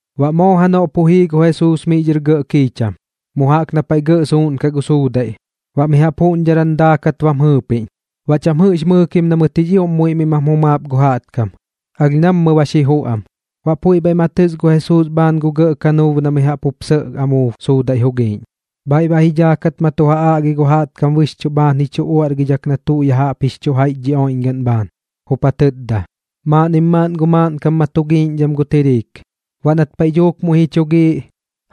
Baꞌ moo janoꞌ pu jii gu Jesuus miꞌ dhɨr kiicham mu jaꞌk na paiꞌ gɇꞌ suuꞌnkaꞌ gu suudaiꞌ, baꞌ mi jaꞌp juꞌñdharan daakat bam jɨɨpiꞌñ. Baꞌ cham jɨꞌx mɨɨkim na mɨt jix ioꞌm muiꞌ miꞌ mam jumaap gu jaꞌtkam, alh nammɨ ba xi juꞌ am. Baꞌ puiꞌ bhaiꞌ ma tɨs gu Jesuus bhaan gu gɇꞌ kanuub na mi jaꞌp jup sɇꞌ amuub suudaiꞌ jugiꞌñ, bhaiꞌ baꞌ ji dhaakat ma tu ja aꞌgi gu jaꞌtkam bɨxchuꞌ bhaan ji chu uaꞌrgidhak na tuꞌ ya jaꞌp jix chu jaiꞌch dhi oiꞌñgaꞌn bhaan, jup ja tɨtda: ―Maaꞌnnim maaꞌn gu maaꞌnkam ma tu giiꞌñdham gu tiriik. Baꞌ nat paiꞌ dhuuk muiꞌ ji chu giiꞌ,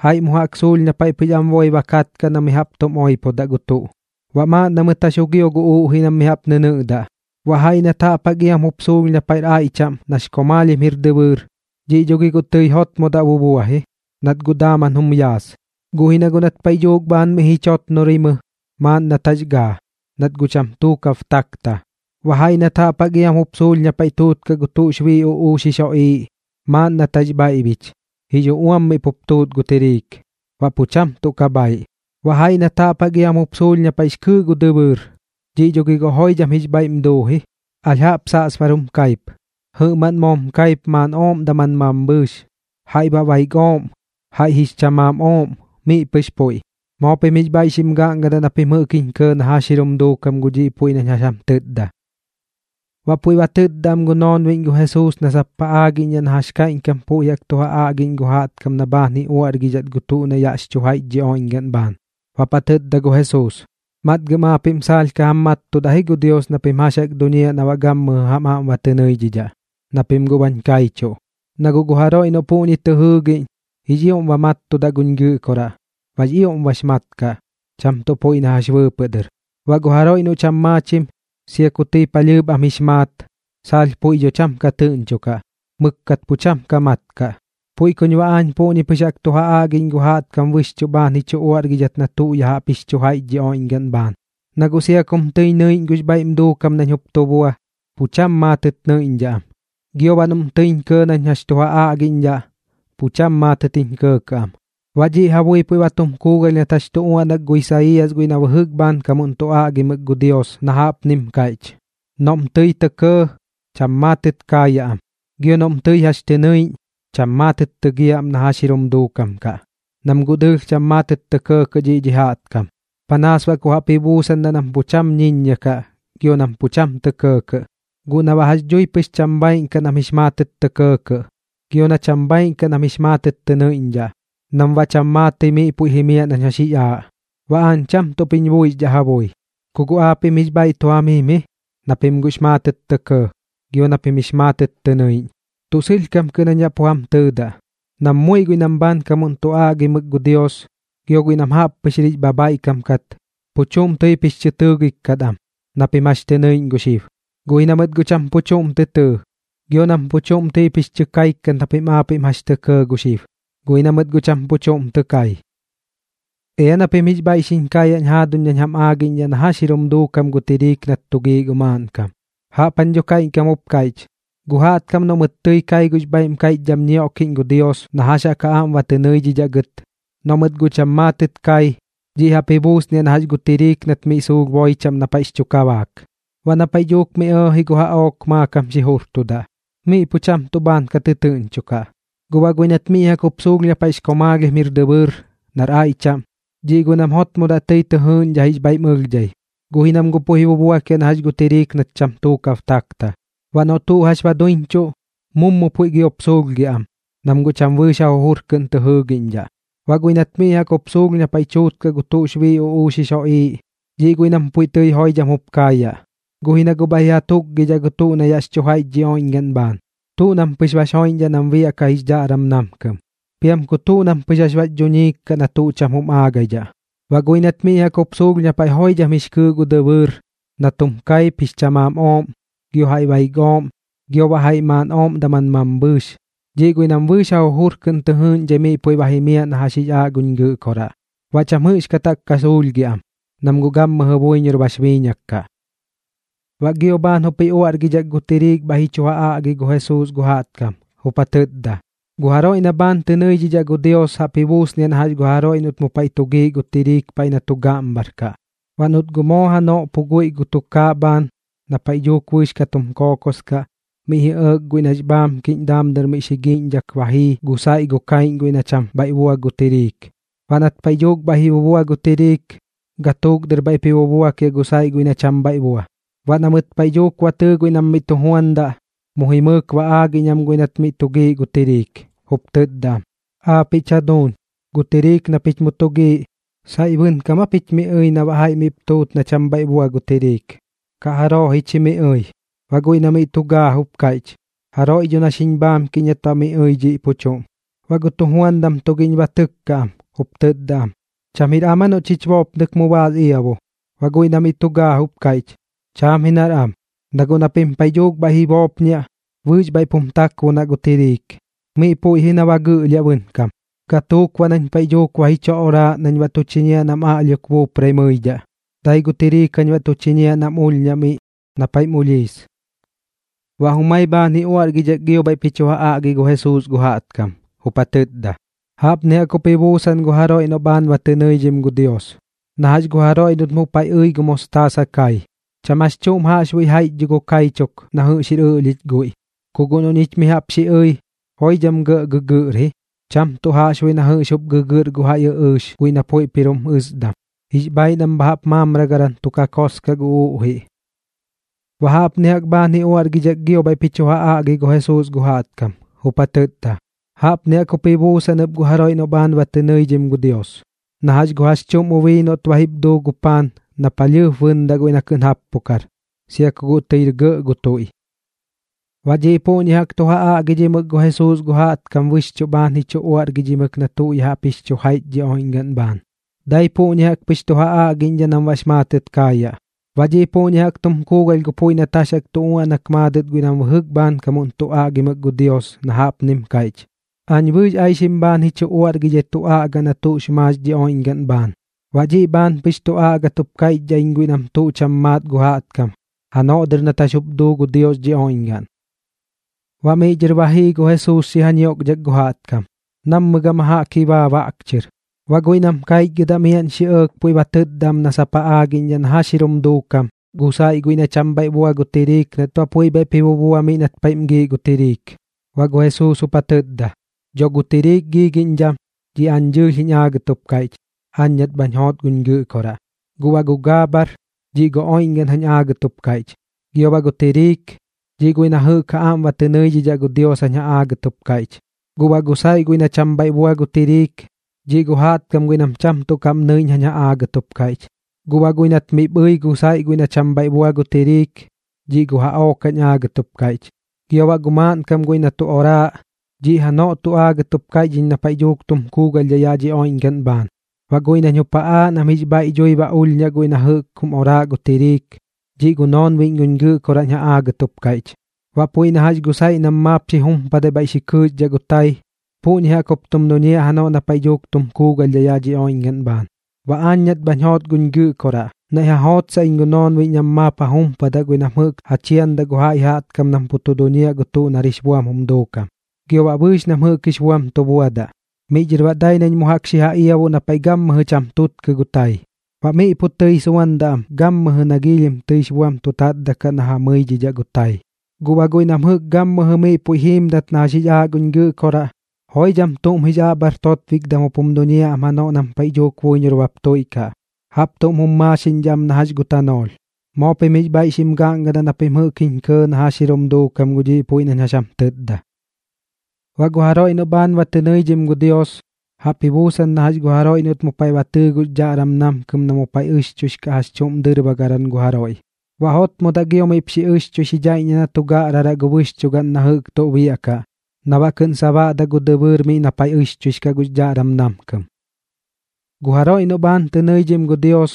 jaiꞌ mu jaꞌk suulh na paiꞌ pɨx am boi ba katkaꞌ na mi jaꞌp tum oipodaꞌ gu tuꞌ, baꞌ maaꞌn na mɨt jax jugio gu uꞌjiꞌ nam mi jaꞌp nɨnɨꞌdaꞌ. Baꞌ jaiꞌ nat jaꞌp jaꞌk iam jup suulh na paiꞌr aiꞌ chaꞌm nax komaalhim jir dɨbɨɨr, dhiꞌ dho gi guꞌ tɨi jotmodaꞌ bubua ji, nat guꞌ daaman jum yaas. Guꞌ ji na guꞌ nat paiꞌ dhuuk bhaan miꞌ ji chotnorimɨ, maaꞌn nat jax gaa, nat guꞌ cham tuukab takta. Baꞌ jaiꞌ nat jaꞌp jaꞌk iam jup suulh na paiꞌ tuutkaꞌ gu tuꞌx bii uꞌuux jix joꞌiiꞌ, maaꞌn nat jax bhaiꞌbich, jix uꞌuam miꞌ pup tuut gu tiriik, baꞌ pu cham tuꞌ ka bhaiꞌ. Baꞌ jaiꞌ nat jaꞌp jaꞌk iam jup suulh na paiꞌx kɨɨꞌ gu dɨbɨɨr, dhiꞌ dho gi guꞌ joidham jix bhaiꞌm duu ji. Alh jaꞌp saꞌsbar xim kaip, jɨꞌmaꞌn moom kaip maaꞌn ooꞌm daman mambhɨɨx, jaiꞌ baꞌ baik ooꞌm, jaiꞌ jix chamaam ooꞌm, miꞌ pɨx puiꞌ. Moo pim jix bhaiꞌ xim gaꞌngadaꞌ na pim jɨꞌk jiñ kɇɇ na jax jir jum duukam gu dhiꞌ puiꞌ nañ jax jam tɨtda. Baꞌ puiꞌ ba tɨtda am gu noonbiꞌñ gu Jesuus na sap ja aagiꞌñdhaꞌ na jax kaiꞌñkam puiꞌ jaꞌk tu ja aꞌgiꞌñ gu jaꞌtkam na bhaan ji chu uaꞌrgidhat gu tuꞌ na yaꞌx chu jaiꞌch dhi oiꞌñgaꞌn bhaan. Baꞌp ja tɨtda gu Jesuus: ―Matgɨm aapiꞌm saalh ka jam mattudaꞌ ji gu Dios na pim jax jaꞌk duñiaꞌ na baꞌ gammɨjɨ jam aꞌm ba tɨ nɨidhidhaꞌ, na pim guꞌ bañ kaichuꞌ. Na guꞌ gu jaroiꞌ noꞌ puꞌñi tɨ jɨɨgiꞌñ, jix ioꞌm ba mattudaꞌ guñ Gɨꞌkoraꞌ, baꞌx ioꞌm bax mat kaꞌ, cham tuꞌ puiꞌ na jax bɨɨpɨꞌ dɨr. Baꞌ gu jaroiꞌ noꞌ cham maachim, sia ku tɨi palhɨɨp am jix maat, saalh puiꞌ dho cham ka tɨꞌñchokaꞌ, mɨkkat pu cham ka mat kaꞌ. Puiꞌ kuñ baꞌ aañ puꞌñi pɨx jaꞌk tu ja aꞌgiꞌñ gu jaꞌtkam bɨxchuꞌ bhaan ji chu uaꞌrgidhat na tuꞌ ya jaꞌp jix chu jaiꞌch dhi oiꞌñgaꞌn bhaan, na guꞌ sia kum tɨiñ nɨiꞌñ gux bhaiꞌm duukam nañ jup tu bua, pu cham maatɨꞌ nɨiꞌñdhaꞌ am, gio baꞌ noꞌm tɨiñ kɇɇ nañ jax tu ja aꞌgiꞌñdhaꞌ, pu cham maatɨt jup jiñ kɇɇkɇꞌ am. Baꞌ dhiꞌ ja bui puiꞌ ba tum kuugalh nat jax tu uaꞌnak gu Isaiiyas guiꞌ na bɨjɨk bhaankam tu aꞌgimɨk gu Dios na jaꞌpnim kaiꞌch: Noꞌm tɨi tɇ kɇɇ, cham maatɨt kaayaꞌ am, gio noꞌm tɨi jax tɨ nɨiꞌñ, cham maatɨt tɨgiaꞌ am na jax jir jum duukam kaꞌ. Nam guꞌ dɨɨlh cham maatɨt tɇ kɇɇkɇꞌ dhiꞌ dhi jaꞌtkam, panaas baꞌ ku jaꞌp ji buusandaꞌ nam pu cham ñiññia kaꞌ gio nam pu cham tɇ kɇɇkɇꞌ, guꞌ na baꞌ jax dhui pɨx cham bhaaiꞌn kaꞌ nam jix maatɨt tɇ kɇɇkɇꞌ, gio na cham bhaaiꞌn kaꞌ nam jix maatɨt tɨ nɨiꞌñdhaꞌ, nam baꞌ cham maatɨi miꞌ puiꞌ jimiaꞌ nañ jax jix aaꞌ, baꞌ aañ cham tuꞌp jiñ buixiꞌñdhaꞌ ja bui. ’Ku guꞌ aapiꞌm jix bhaiꞌ tu jam jim ji, na pim guꞌx maatɨt tɇ kɇɇ gio na pim jix maatɨt tɨ nɨiꞌñ. Tuꞌ sɨlhkam kɨꞌn jañ pu jam tɨtda nam muiꞌ guiꞌ nam bhaankam tu aꞌgimɨk gu Dios gio guiꞌ nam jaꞌppɨx jir jix bhabhaiꞌkam kat, pu chuꞌm tɨip jix chɨ tɨɨgik kat am na pim jax tɨ nɨiꞌñ gu xib, guꞌ ji na mɨt guꞌ cham pu chuꞌm tɨ tɨɨ, gio nam pu chuꞌm tɨip jix chɨ kaik kat na pim aapiꞌm jax tɇ kɇɇ gu xib, guꞌ ji na mɨt guꞌ cham pu chuꞌm tɨ kai. ’Ea na pim jix bhaiꞌ xiñ kaayaꞌñ jaaduñ nañ jam aagiꞌñdhaꞌ na jax jir jum duukam gu tiriik nat tu giiꞌ gu maaꞌnkam. Jaꞌp jañ dho kaiꞌñkam jup kaiꞌch: Gu jaꞌtkam noꞌ mɨt tɨi kai gux bhaiꞌm kaiꞌchdham ñioꞌkiꞌñ gu Dios na jax jaꞌk ja aꞌm ba tɨ nɨidhidhaꞌ gɨt, noꞌ mɨt guꞌ cham maatɨt kai, dhiꞌ jaꞌp ji buusniaꞌ na jax gu tiriik nat miꞌ suulh boi chaꞌm na paiꞌx chu kabaak. Baꞌ na paiꞌ dhuuk miꞌ ji ɇɇji gu jaꞌook, maakam xi jurtudaꞌ, miꞌ pu cham tuꞌ bhaan ka tɨtɨɨꞌñchokaꞌ. Guꞌ baꞌ guiꞌ nat miꞌ jaꞌk jup suulh na paiꞌx komaalhim jir dɨbɨɨr nar aiꞌ chaꞌm, dhiꞌ guiꞌ nam jotmodaꞌ tɨi tɨ jɨɨꞌñdhaꞌ jix bhaiꞌm ɨlhdhai, guꞌ ji nam guꞌ puiꞌ ji bubuakiaꞌ na jax gu tiriik nat cham tuukab takta. Baꞌ noꞌ tuꞌ jax ba ja duiñchuꞌ, mummɨ puiꞌ giop suulhgiaꞌ am, nam guꞌ cham bɨɨx ja jujur kɨꞌn tɨ jɨɨgiꞌñdhaꞌ. Baꞌ guiꞌ nat miꞌ jaꞌk jup suulh na paiꞌ tuutkaꞌ gu tuꞌx bii uꞌuux jix joꞌiiꞌ, dhiꞌ guiꞌ nam puiꞌ tɨi joidham jup kaayaꞌ, guꞌ ji na guꞌ bhaiꞌ ji ja tukgidhaꞌ gu tuꞌ na yaꞌx chu jaiꞌch dhi oiꞌñgaꞌn bhaan. Tuꞌ nam pɨx bax joiꞌñdhaꞌ nam biaꞌkaꞌ jix dhaꞌram namkɨm, piam ku tuꞌ nam pɨx jax bax dhuñiim kaꞌ na tuꞌ cham jum aagidhaꞌ. Baꞌ guiꞌ nat miꞌ jaꞌk jup suulh na paiꞌ joidham jix kɨɨꞌ gu dɨbɨɨr nat jum kaip jix chamaam ooꞌm, gio jaiꞌ baik ooꞌm, gio baꞌ jaiꞌ maaꞌn ooꞌm daman mambhɨɨx, dhiꞌ guiꞌ nam bɨɨx ja jujur kɨꞌn tɨ jɨɨꞌñdhai miꞌ puiꞌ ba jimiaꞌ na jax jix aaꞌ guñ Gɨꞌkoraꞌ, baꞌ cham jɨꞌxkat jaꞌk ka suulhgiaꞌ am, nam guꞌ gammɨjɨ buiñor bax biiñak kaꞌ. Baꞌ gio bhaan jup ji uaꞌrgidhak gu tiriik bhaiꞌ ji chu ja aꞌgi gu Jesuus gu jaꞌtkam, jup ja tɨtda: ―Gu jaroiꞌ na bhaan tɨ nɨidhidhaꞌ gu Dios jaꞌp ji buusniaꞌ na jax gu jaroiꞌ noꞌt mu paiꞌ tu giiꞌ gu tiriik paiꞌ na tu gaꞌmbhar kaꞌ. Baꞌ noꞌt guꞌ moo janoꞌ pu guiꞌ gu tukaaꞌ bhaan na paiꞌ dhuuk bɨɨx ka tum kookos kaꞌ, miꞌ ji ɇɇk guiꞌ nax bhaamkiꞌñ daam dɨr miꞌp xi giiꞌñdhak ba jii gu saiꞌ gu kaiꞌñ guiꞌ na cham bhaiꞌ bua gu tiriik. Baꞌ nat paiꞌ dhuuk bhaiꞌ ji bubua gu tiriik, gatuuk dɨr bhaiꞌp ji bubuakiaꞌ gu saiꞌ guiꞌ na cham bhaiꞌ bua. Baꞌ na mɨt paiꞌ dhuuk ba tɨɨ guiꞌ nam miꞌ tu juandaꞌ, mu jimɨɨk ba aagiꞌñ am guiꞌ nat miꞌ tu giiꞌ gu tiriik, jup tɨtda am: “Aapiꞌch jaduuñ, gu tiriik na pich mu tu giiꞌ, ¿saiꞌ bɨnkam aa pich miꞌ ɨi na baꞌ jaiꞌ miꞌp tuut na cham bhaiꞌ bua gu tiriik? ¿Kaꞌ jaroo ji chi miꞌ ɨi?” Baꞌ guiꞌ na miꞌ tu gaa jup kaiꞌch: “Jaroiꞌ dho na xiñ bhaamkiꞌñ nat baꞌ miꞌ ɨi dhiꞌ pu chuꞌm.” Baꞌ gu tujuandam tugiꞌñ ba tɨkka am, jup tɨtda am: “¿Cham jir am aa noꞌ chich boopnɨk mu baas iabu?” Baꞌ guiꞌ na miꞌ tu gaa jup kaiꞌch: “Cham ji nar am, na guꞌ na pim paiꞌ dhuuk bhaiꞌ ji boopñiaꞌ, bɨɨx bhaiꞌp jim takbonaꞌ gu tiriik. Miꞌ puiꞌ ji na ba gɨꞌlhiaꞌ bɨnkam, gatuuk baꞌ nañ paiꞌ dhuuk ba ji chu oraaꞌ nañ baꞌ tu chiñiaꞌ nam aꞌlhiok buuprai mɨidhaꞌ, dai gu tiriik jañ baꞌ tu chiñiaꞌ nam ulhñaꞌ miꞌ na paiꞌm ulhiis.” Baꞌ jumai bhaan ji uaꞌrgidhak gio bhaiꞌp ji chu ja aꞌgi gu Jesuus gu jaꞌtkam, jup ja tɨtda: ―Jaꞌpni jaꞌk jup ji buusan gu jaroiꞌ noꞌ bhaan ba tɨ nɨidhim gu Dios, na jax gu jaroiꞌ noꞌt mu paiꞌ ɨi gu mostaasa kai. Cham jax chuꞌm jaꞌxbuiꞌx jaiꞌch dho gu kaichuk na jɨꞌx jir ɨlhiꞌch guiꞌ, ku guꞌ noꞌ ñich mi jaꞌp xi ɨi, joidham gɇꞌ gɨgɨꞌr ji, cham tuꞌ jaꞌxbuiꞌ na jɨꞌx jup tɨ gɨgɨꞌr gu jaiꞌ ɨꞌɨɨx guiꞌ na puiꞌp jir jum ɨsdam. Jix bhaiꞌ nam bha jaꞌp maamragaran tu kakos kaꞌ gu uꞌjiꞌ. Baꞌ jaꞌpni jaꞌk bhaan ji uaꞌrgidhak gio bhaiꞌp ji chu ja aꞌgi gu Jesuus gu jaꞌtkam, jup ja tɨtda: ―Jaꞌpni jaꞌk jup ji buusan ɨp gu jaroiꞌ noꞌ bhaan ba tɨ nɨidhim gu Dios, na jax gu jax chuꞌm ubii noꞌt ba jip duu gu paan na palhɨɨp bɨndaꞌ guiꞌ na kɨꞌn jappukar, sia ku guꞌ tɨir gɇꞌ gu tuiꞌ. Baꞌ dhiꞌ puꞌñi jaꞌk tu ja aꞌgidhimɨk gu Jesuus gu jaꞌtkam bɨxchuꞌ bhaan ji chu uaꞌrgidhimɨk na tuꞌ ya jaꞌp jix chu jaiꞌch dhi oiꞌñgaꞌn bhaan. Dai puꞌñi jaꞌk pɨx tu ja aꞌgiꞌñdhaꞌ nam baꞌx maatɨt kaayaꞌ. Baꞌ dhiꞌ puꞌñi jaꞌk jum kuugalh gu puiꞌ nat jax jaꞌk tu uaꞌnak maadɨt guiꞌ nam bɨjɨk bhaankam tu aꞌgimɨk gu Dios, na jaꞌpnim kaiꞌch: Aañ bɨɨx aixim bhaan ji chu uaꞌrgidhai tu aꞌgaꞌ na tuꞌx maax dhi oiꞌñgaꞌn bhaan, baꞌ dhiꞌ bhaan pɨx tu aꞌgat jup kaiꞌchdhaꞌ iñ guiꞌ nam tuꞌ cham maat gu jaꞌtkam janoꞌ dɨr nat jax jup duu gu Dios dhi oiꞌñgaꞌn. Baꞌ miꞌ dhɨr ba jii gu Jesuus xi ja ñioꞌkdhak gu jaꞌtkam, nammɨ jaꞌk gama jaꞌk ji baa baꞌk chɨr. Baꞌ guiꞌ nam kaichgɨdaꞌ miaꞌn xi ɇɇk puiꞌ ba tɨtda am na sap ja aagiꞌñdhaꞌ na jax jir jum duukam gu saiꞌ guiꞌ na cham bhaiꞌ bua gu tiriik nat baꞌ puiꞌ bhaiꞌp ji bubua miꞌ na paiꞌm giiꞌ gu tiriik. Baꞌ gu Jesuus jup ja tɨtda: ―Dho gu tiriik giigiꞌñdham, dhiꞌ aañ dɨɨlh jiñ aagat jup kaiꞌch, aañ nat bhañ joot guñ Gɨꞌkoraꞌ. Guꞌ baꞌ gu gaabhar, dhiꞌ gu oiꞌñgaꞌn jañ aagat jup kaiꞌch, gio baꞌ gu tiriik, dhiꞌ guiꞌ na jɨꞌk ja aꞌm ba tɨ nɨidhidhaꞌ gu Dios jañ ja aagɨt jup kaiꞌch. Guꞌ baꞌ gu saiꞌ guiꞌ na cham bhaiꞌ bua gu tiriik, dhiꞌ gu jaꞌtkam guiꞌ nam cham tuꞌ kaꞌm tɨ nɨiꞌñ jañ ja aagɨt jup kaiꞌch. Guꞌ baꞌ guiꞌ nat miꞌp ɨi gu saiꞌ guiꞌ na cham bhaiꞌ bua gu tiriik, dhiꞌ gu jaꞌook jañ aagat jup kaiꞌch. Gio baꞌ gu maaꞌnkam guiꞌ na tu oraaꞌ, dhiꞌ janoꞌ tu aagɨt jup kaiꞌch iñ na paiꞌ dhuuk tum kuugalhdhaꞌ yaꞌ dhi oiꞌñgaꞌn bhaan. Baꞌ guiꞌ nañ jup ja aaꞌ nam jix bhaiꞌ dhui ba ulhñaꞌ guiꞌ na jɨꞌk jum oraaꞌ gu tiriik, dhiꞌ gu noonbiꞌñ guñ Gɨꞌkoraꞌ nañ ja aagɨt jup kaiꞌch ɨp. Baꞌ puiꞌ na jax gu saiꞌ nam maap xi jumpadai bhaiꞌ xi kɨɨxdhaꞌ gu tai, puꞌñi jaꞌk jup tum duñiaꞌ janoꞌ na paiꞌ dhuuk tum kuugalhdhaꞌ yaꞌ dhi oiꞌñgaꞌn bhaan. Baꞌ aañ nat bhañ joot guñ Gɨꞌkoraꞌ, naiꞌ ja jootsaꞌ iñ gu noonbiꞌñ nam maap ja jumpadaꞌ guiꞌ nam jɨꞌk ja chiandaꞌ gu jaiꞌ jaꞌtkam nam pu tu duñiaꞌ gu tuꞌ nar jix buam jum duukam, gio baꞌ bɨɨx nam jɨꞌk jix buam tu buadaꞌ. Miꞌ dhɨr baꞌ dai nam mu jaꞌk xi ja iabuꞌ na paiꞌ gammɨjɨ cham tutkɨ gu tai, baꞌ miꞌ pu tɨi suandaꞌ am gammɨjɨ na giilhim tɨix buam tu tatdaꞌkaꞌ na ja mɨidhidhaꞌ gu tai. Guꞌ baꞌ guiꞌ nam jɨꞌk gammɨjɨ miꞌ puiꞌ jiimdat na jax jix aaꞌ guñ Gɨꞌkoraꞌ, joidham tuꞌm jix aꞌbhar totbikdam jup jum duñiaꞌ am janoꞌ nam paiꞌ dhuuk buiñor bap tuiꞌkaꞌ, jaꞌp tuꞌm jum maaxiꞌñdhaꞌ am na jax gu tanoolh. Moo pim jix bhaiꞌ xim gaꞌngadaꞌ na pim jɨꞌk jiñ kɇɇ na jax jir jum duukam gu dhiꞌ puiꞌ nañ jax jam tɨtda. ’Baꞌ gu jaroiꞌ noꞌ bhaan tɨ nɨidhim gu Dios, jaꞌp ji buusan na jax gu jaroiꞌ noꞌt mu paiꞌ ba tɨɨ gux dhaꞌram namkɨm na mu paiꞌ ɨxchuix kaꞌ jax chuꞌm dɨrbagaran gu jaroiꞌ. Baꞌ jotmodaꞌ gio miꞌp xi ɨxchui xi dhaiꞌññiaꞌ na tu gaꞌraraꞌ gu bɨxchugaꞌn na jɨꞌk tuꞌ biaꞌkaꞌ na baꞌ kɨꞌn ba sabaꞌdaꞌ gu dɨbɨɨr miꞌ na paiꞌ ɨxchuix kaꞌ gux dhaꞌram namkɨm. ’Gu jaroiꞌ noꞌ bhaan tɨ nɨidhim gu Dios,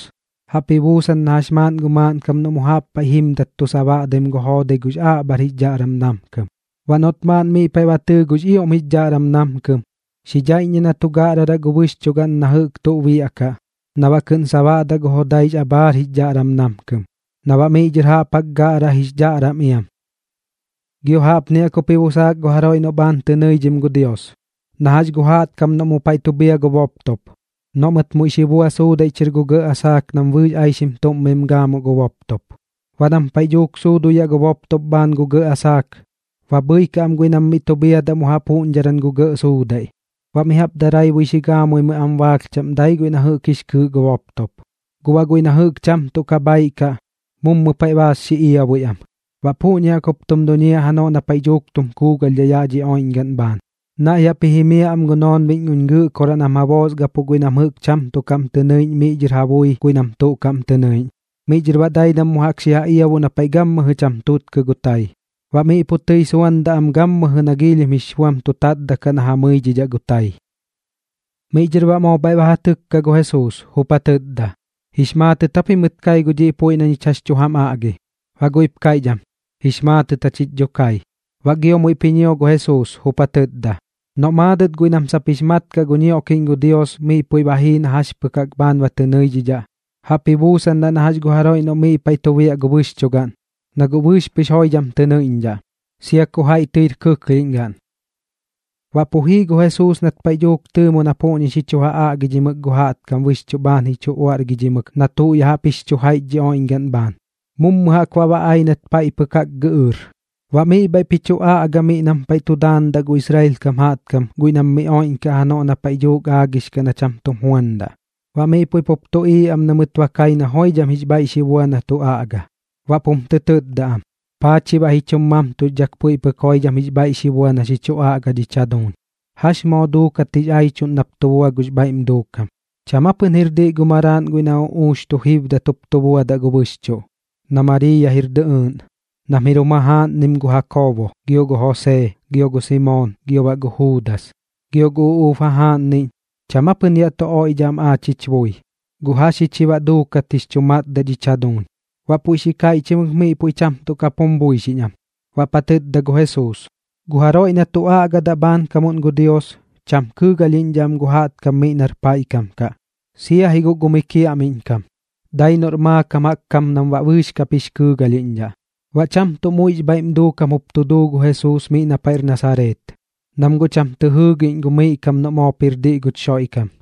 jaꞌp ji buusan na jax maaꞌn gu maaꞌnkam noꞌ mu jaꞌp paiꞌ jimdat tu sabaꞌdaim gu joodai gux aꞌbhar jix dhaꞌram namkɨm. Baꞌ noꞌt maaꞌn miꞌ paiꞌ ba tɨɨ gux ioꞌm jix dhaꞌram namkɨm, xi dhaiꞌññiaꞌ na tu gaꞌraraꞌ gu bɨxchugaꞌn na jɨꞌk tuꞌ biaꞌkaꞌ na baꞌ kɨꞌn ba sabaꞌdaꞌ gu joodaix abhaar jix dhaꞌram namkɨm, na baꞌ miꞌ dhɨr jaꞌp jaꞌk gaꞌraꞌ jix dhaꞌram iam. ’Gio jaꞌpni jaꞌk jup ji busaak gu jaroiꞌ noꞌ bhaan tɨ nɨidhim gu Dios, na jax gu jaꞌtkam noꞌm mu paiꞌ tu bhia gu boptop, noꞌ mɨt muiꞌ xi bua suudaiꞌ chɨr gu gɇꞌ asaak nam bɨɨx aixim tuꞌm mim gaamuꞌ gu boptop. Baꞌ nam paiꞌ dhuuk suuduyaꞌ gu boptop bhaan gu gɇꞌ asaak, ba bhɨikaꞌ am guiꞌ nam miꞌ tu bhiadaꞌ mu jaꞌp juꞌñdharan gu gɇꞌ suudaiꞌ. Baꞌ mi jaꞌp daraibui xi gaamuimɨi am baalh chaꞌm dai guiꞌ na jɨꞌk jix kɨɨꞌ gu boptop, guꞌ baꞌ guiꞌ na jɨꞌk cham tuꞌ bhaiꞌ kaꞌ, mummɨ paiꞌ baas xi iabui am. Baꞌ puꞌñi jaꞌk jup tum duñiaꞌ janoꞌ na paiꞌ dhuuk tum kuugalhdhaꞌ yaꞌ dhi oiꞌñgaꞌn bhaan. Naiꞌ jaꞌp ji jimiaꞌ am gu noonbiꞌñ guñ Gɨꞌkoraꞌ nam ja boosgapuꞌ guiꞌ nam jɨꞌk cham tuꞌ kaꞌm tɨ nɨiꞌñdhaꞌ miꞌ dhɨr ja bui guiꞌ nam tuꞌ kaꞌm tɨ nɨiꞌñ. Miꞌ dhɨr baꞌ dai nam mu jaꞌk xi ja iabuꞌ na paiꞌ gammɨjɨ cham tutkɨ gu tai, baꞌ miꞌ pu tɨi suandaꞌ am gammɨjɨ na giilhim jix buam tu tatdaꞌkaꞌ na ja mɨidhidhaꞌ gu tai. Miꞌ dhɨr baꞌ moo bhaiꞌ ba ja tɨkka gu Jesuus, jup ja tɨtda: ―¿Jix maatɨt aa pimɨt kai gu dhiꞌ puiꞌ na ñich jax tu jam aꞌgi? Baꞌ guiꞌp kaiꞌch am: ―Jix maatɨt jachich dho kai. Baꞌ gio muiꞌp ji ñio gu Jesuus, jup ja tɨtda: ―Noꞌ maadɨt guiꞌ nam sap jix mat kaꞌ gu ñioꞌkiꞌñ gu Dios miꞌ puiꞌ ba jii na jax pɨk jaꞌk bhaan ba tɨ nɨidhidhaꞌ, jaꞌp ji buusandaꞌ na jax gu jaroiꞌ noꞌ miꞌ paiꞌ tu biaꞌ gu bɨxchugaꞌn, na guꞌ bɨɨx pɨx joidham tɨ nɨiꞌñdhaꞌ, sia ku jaiꞌ tɨir kɨklhiꞌñgaꞌn. Baꞌ pu jii gu Jesuus nat paiꞌ dhuuk tɨɨmo na miꞌ puꞌñi xi chu ja aꞌgidhimɨk gu jaꞌtkam bɨxchuꞌ bhaan ji chu uaꞌrgidhimɨk na tuꞌ ya jaꞌp jix chu jaiꞌch dhi oiꞌñgaꞌn bhaan, mummɨ jaꞌk baꞌ ba ai nat paiꞌ pɨk jaꞌk gɨꞌɨɨr. Baꞌ miꞌ bhaiꞌp ji chu aꞌga miꞌ nam paiꞌ tu daandaꞌ gu Israel kam jaꞌtkam guiꞌ nam miꞌ oiꞌñkaꞌ janoꞌ na paiꞌ dhuuk aagix kaꞌ na cham tum juandaꞌ. Baꞌ miꞌ puiꞌ pup tuꞌiiꞌ am na mɨt ba kai na joidham jix bhaiꞌ xi bua na tu aꞌga, baꞌp jum tɨ tɨtda am: ―¿Paa chi baꞌ ji chum mamtuxdhak puiꞌ pɨk joidham jix bhaiꞌ xi bua na xi chu aꞌga dhich jaduuñ? ¿Jax moo duukat jix aichuꞌn nap tu bua gux bhaiꞌm duukam? ¿Cham aa pɨn jir diꞌ nar maraaꞌn guiꞌ na uꞌuux tu jiibdat jup tu buadaꞌ gu bɨxchuꞌ, na Mariiya jir dɨꞌɨɨꞌn, nam jir jum jajaaꞌnnim gu Jakoobo, gio gu Josee, gio gu Simoon, gio baꞌ gu Juudas? Gio gu uꞌuub jajaaꞌnniꞌñ, ¿cham ja pɨn yaꞌ tu oiꞌdhaꞌ am aach jich bui? ¿Guꞌ jax ji chi baꞌ duukat jix chu matdaꞌ dhich jaduuñ? Baꞌ puiꞌ xi kaiꞌchimɨk miꞌ puiꞌ cham tuꞌ kap jum buixiꞌñ am. Baꞌp ja tɨtda gu Jesuus: ―Gu jaroiꞌ na tu aꞌgadaꞌ bhaankam gu Dios, cham kɨɨgalhiꞌñdhaꞌ am gu jaꞌtkam miꞌ nar paiꞌ kam kaꞌ, sia ji guꞌ gu miꞌ kiaꞌmiꞌñ kam. Dai noꞌr maakam jaꞌk kam nam baꞌ bɨɨx kap jix kɨɨgalhiꞌñdhaꞌ. Baꞌ cham tuꞌ muiꞌx bhaiꞌm duukam jup tu duu gu Jesuus miꞌ na paiꞌr Nasareet, nam guꞌ cham tɨ jɨɨgiꞌñ gu miꞌ kam noꞌ moop jir diꞌ guch Xoiꞌkam.